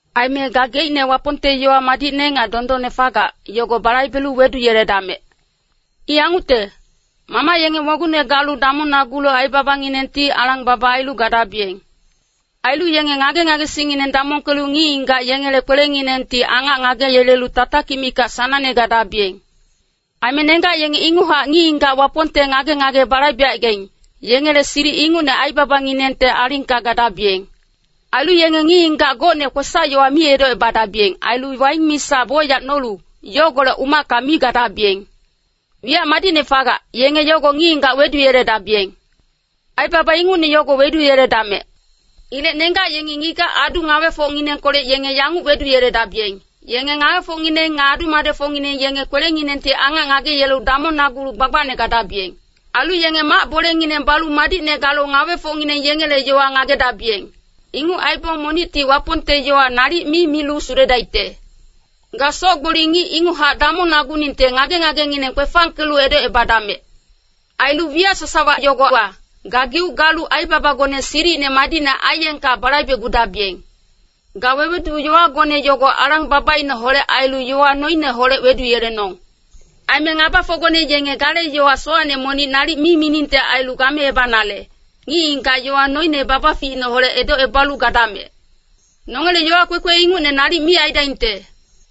Aime gageicne Wapongte yowa madicne nga dondonne fagac, yogo balaibelu weduyeledamec. I yangucte, mamac yenge mogungne galu damongnagulu aibabanginengti alang-baba ailu gadabiyeng. Ailu yenge ngage-ngagesingngineng damongkelu ngic-ngigac yengele kwelenginengti angac ngageyelelu tatakic mikac sanangne gadabiyeng. Aime nenggac yenge inguchac ngic-ngigac Wapongte ngage-ngage balaibecaigaing, yengele silic ingucne aibabanginengte alingka gadabiyeng. Ailu yenge ngic-ngigac gocne kwesac-yowa mi edocebadabiyeng. Ailu waing misa bocyac nolu, yogolec umacka mi gadabiyeng. Wiyac madicne fagac, yenge yogo ngic-ngigac weduyeledabiyeng. Aibaba ingucne yogo weduyeledamec. Ilec nenggac yengi ngigac-adu ngawefocnginengkolec yenge yanguc weduyeledabiyeng. Yenge ngawefocngineng nga adu-madecfocngineng yenge kwelenginengti angac ngageyelelu damongnagulu gbagbacne gadabiyeng. Ailu yenge mac-bolengineng balu madicne galu ngawefocngineng yengele yowa ngagedabiyeng. Inguc aibong monicti Wapongte yowa nalic mi milu suledaicte. Ga soc-gboli ngic inguchac damongnaguningte ngage-ngagengineng kwefangkelu edocebadamec. Ailu wiyac sasawa yogowa, gageuc galu aibabagone silicine madicne aiyengka balaibecgudabiyeng. Ga wewedu-yowagone yogo alang-babaineholec ailu yowa noineholec weduyelenong. Aime ngabafocgone yenge gale yowa sowacne monic nalic mi miningte ailu gameebanale, ngic-ngigac yowa noine babaficineholec edocebalu gadamec. Nongele yowa kwekwe ingucne nalic mi aidaingte.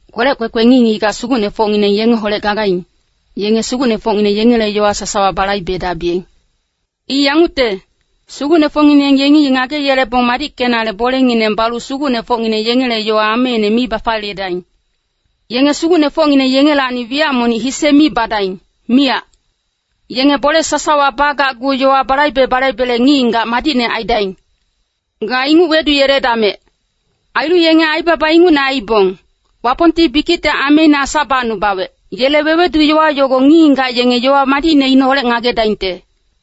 Kwelec kwekwe ngic-ngigac sugucnefocngineng yengeholec gagaing, yenge sugucnefocngineng yengele yowa sasawa balaibedabiyeng. I yangucte, sugucnefocngineng yengi ngageyelebong madickenale bolengineng balu sugucnefocngineng yengele yowa ameine mi bafaliyedaing. Yenge sugucnefocngineng yengelacni wiyac monic hise mi badaing, miyac. Yenge bole sasawa bagacgu yowa balaibe-balaibele ngic-ngigac madicne aidaing. Ga inguc weduyeledamec. Ailu yenge aibaba ingucne aibong, Wapongti bikicte ameine Asa bacnubawec, yele wewedu-yowa yogo ngic-ngigac yenge yowa madicneineholec ngagedaingte.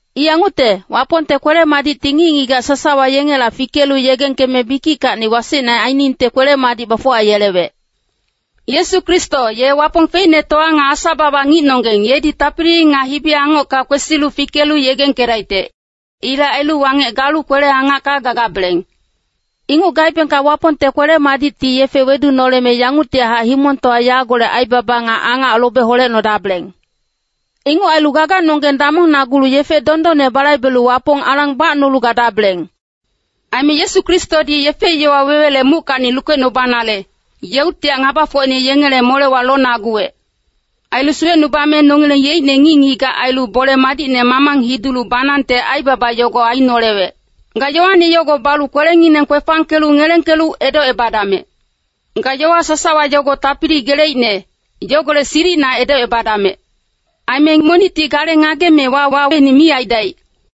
I yangucte, Wapongte kwele-madicti ngic-ngigac sasawa yengela fikelu yegengkeme bikickacni wasecne ainingte kwele-madic bafuwayelewec. Yesu Kristo, ye Wapong feicnetowa nga Asa-baba ngicnonggeng, yedi tapili nga hibi-angocka kwesilu fikelu yegengkedaicte. Ilec ailu wangec galu kwele-angacka gagabeleng. Inguc gaebengka Wapongte kwele-madicti yefe wedunoleme yanguctihac himongtowa yagolec aibaba nga angac lobe holecnodabeleng. Inguc ailu gaganonggeng damongnagulu yefe dondonne balaibelu Wapong alang bacnolu gadabeleng. Aime Yesu Kristodi yefe-yowa wewele muckacni lukecnubanale, yeuctihac ngabafocine yengele molewa lonaguwec. Ailu suwecnubame nongileng yeicne ngic-ngigac ailu bole madicne mamang hidulu banangte aibaba yogo ainolewec. Ga yowane yogo balu kwelengineng kwefangkelu ngelengkelu edocebadamec. Ga yowa sasawa yogo tapili geleicne, yogolec silicina edocebadamec. Aime monicti gale ngageme wawaine mi aidaic.